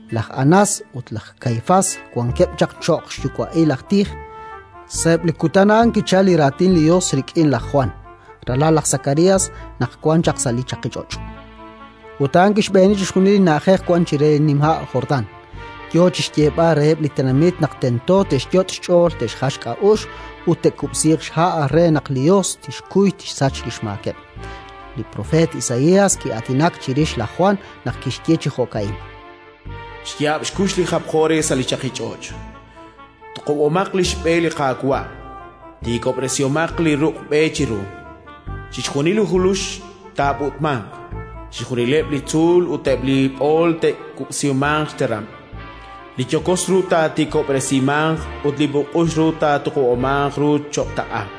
Laj Anás ut laj Kaifás wankeb' chaq cho'q xyuwa'il aj tij. Sa'eb' li kutan a'an kichalk li Raatin li Yos rik'in laj Jwan, ralal laj Sakarías, naq wan chaq sa' li chaqich'och'. Ut a'an kixb'eeni chixjunil li na'ajej wank chire li nima' Jordán, yo chi xyeeb'al reheb' li tenamit naq tento te'xyot' xch'ool te'xjal xk'a'uxl ut te'kub'siiq xha' re naq li Yos tixkuy tixsach li xmaakeb'. Li propeet Isaías ki'aatinak chirix laj Jwan naq kixye chi jo'ka'in: “Xyaab' xkux li japjo re sa' li chaqich'och': «Tuqub'omaq li xb'e li Qaawa', tiikob'resihomaq li ruq' b'e chiru. Chixjunil li julux taab'ut'manq, chixjunileb' li tzuul ut eb' li b'ool te'kub'simanq xteram; li yokos ru taatiikob'resimanq ut li b'uk'ux ru taatuqub'amanq ru cho'q taq'a.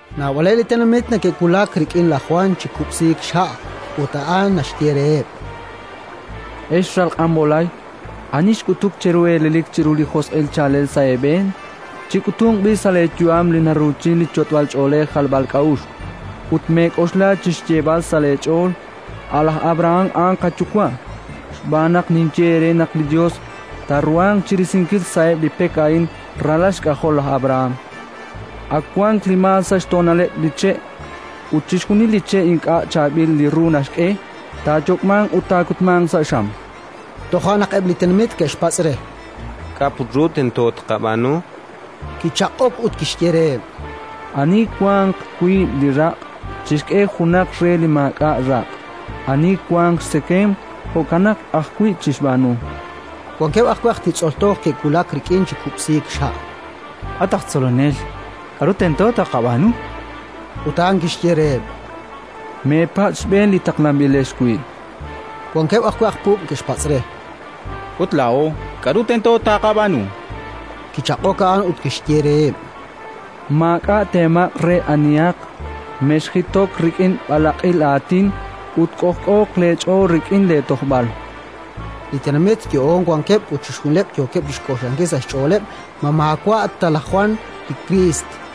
Naab'aleb' li tenamit neke'wulak rik'in laj Jwan chi kub'siik xha' ut a'an naxye reheb': “Ex ral q'anb'olay, ani xk'utuk cheru elelik chiru li josq'il chaalel sa' eeb'een? Chik'utunq b'i' sa' leeyu'am li naruuchin li yot'b'ach'oolej jalb'ak'a'uxl, ut mex'ok chi xyeeb'al sa' leech'ool: «A' laj Abrahán a'an qayuwa'». Xb'aan naq ninye eere naq li Yos taaruhanq chi risinkil sa'eb' li pek a'in ralal xk'ajol laj Abrahán. Ak wank li maal sa' xtoonaleb' li che'; ut chixjunil li che' ink'a' chaab'il li ru naxk'e, taayok'manq ut taakutmanq sa' xam”. Toja' naq eb' li tenamit ke'xpatz' re: —K'a' put ru tento taaqab'aanu? Kichaq'ok ut kixye reheb': —Ani wanq wiib' li raq' chixk'e junaq re li maak'a' raq'; ani wanq xtzekemq, jo'kanaq ajwi' chixb'aanu. Wankeb' ajwi' aj titz'ol toj ke'wulak rik'in chi kub'siik xha': —At aj Tzolonel, k'aru tento taaqab'aanu? Ut a'an kixye reheb': —Meepatz' xb'een li taqlanb'ilex wi'. Wankeb' ajwi' aj puub' ke'xpatz' re: —Ut laa'o, k'aru tento taaqab'aanu? Kichaq'ok a'an ut kixye reheb': —Maak'a' teemaq' re anihaq, mexjitok rik'in b'alaq'il aatin ut k'ojk'ooq leech'ool rik'in leetojb'al. Li tenamit yo'oon wankeb' ut chixjunileb' yookeb' chi xk'oxlankil sa' xch'ooleb' ma maawa' ta laj Jwan li Kriist.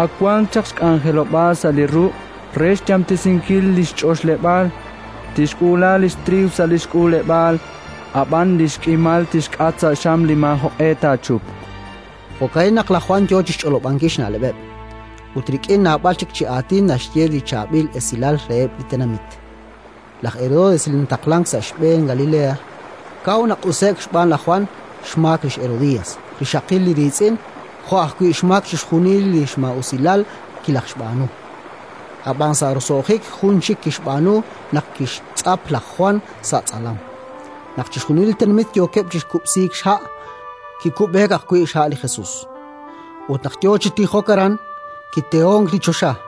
Ak wan chaq xk'anjelob'aal sa' li ruq' re xyamtesinkil li xch'oxleb'aal: tixk'uula li xtriiw sa' li xk'uuleb'aal, ab'an li xk'imal tixk'at sa' xam li maajoq'e taachupq”. Jo'ka'in naq laj Jwan yo chi xch'olob'ankil xna'leb'eb'; ut rik'in naab'al chik chi aatin naxye li Chaab'il Esilal reheb' li tenamit. Laj Herodes, li nataqlank sa' xb'een Galilea, kaw naq'use'k xb'aan laj Jwan xmaak li xHerodías, rixaqil li riitz'in, jo' ajwi' xmaak chixjunil li maa'usilal kilajxb'aanu. Ab'an sa' roso'jik jun chik kixb'aanu naq kixtz'ap laj Jwan sa' tz'alam. Naq chixjunil li tenamit yookeb' chi kub'siik xha', kikub'eek ajwi' xha' li Jesus. Ut naq yo chi tijok aran, kitehonk li choxa: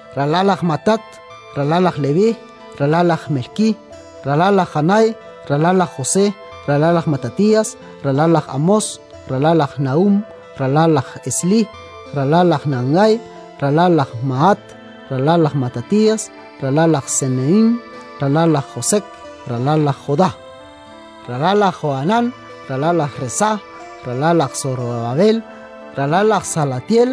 ralal laj Matat, ralal laj Leví, ralal laj Melkí, ralal laj Janay, ralal laj José, ralal laj Matatías, ralal laj Amós, ralal laj Nahúm, ralal laj Eslí, ralal laj Nangay, ralal laj Mahat, ralal laj Matatías, ralal laj Semehín, ralal laj Josek, ralal laj Jodá, ralal laj Johanán, ralal laj Resá, ralal laj Sorobabel, ralal laj Salatiel,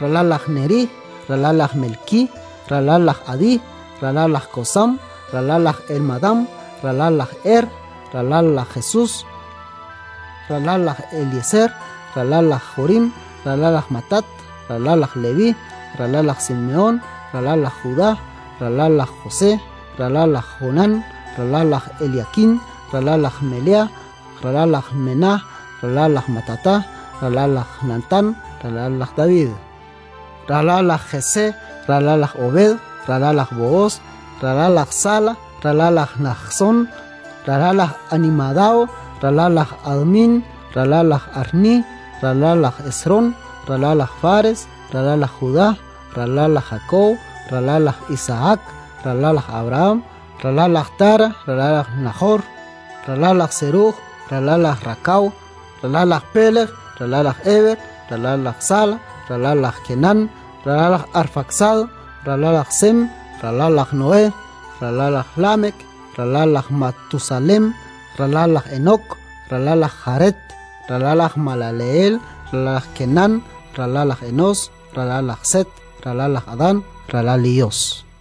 ralal laj Nerí, ralal laj Melkí, ralal laj Adí, ralal laj Kosam, ralal laj Elmadam, ralal laj Er, ralal laj Jesus, ralal laj Elieser, ralal laj Jorim, ralal laj Matat, ralal laj Leví, ralal laj Simehón, ralal laj Judá, ralal laj José, ralal laj Jonam, ralal laj Eliakín, ralal laj Meleá, ralal laj Mená, ralal laj Matatá, ralal laj Natán, ralal laj David, ralal laj Jesé, ralal laj Obed, ralal laj Bohos, ralal laj Sala, ralal laj Najsón, ralal laj Aminadab, ralal laj Admin, ralal laj Arní, ralal laj Esrom, ralal laj Fares, ralal laj Judá, ralal laj Jakob, ralal laj Isahak, ralal laj Abrahán, ralal laj Tara, ralal laj Najor, ralal laj Seruj, ralal laj Rakaw, ralal laj Pélej, ralal laj Eber, ralal laj Sala, ralal laj Kenán, ralal laj Arfaksad, ralal laj Sem, ralal laj Noé, ralal laj Lámek, ralal laj Matusalén, ralal laj Enok, ralal laj Járet, ralal laj Malelehel, ralal laj Kenán, ralal laj Enós, ralal laj Set, ralal laj Adán, ralal li Yos.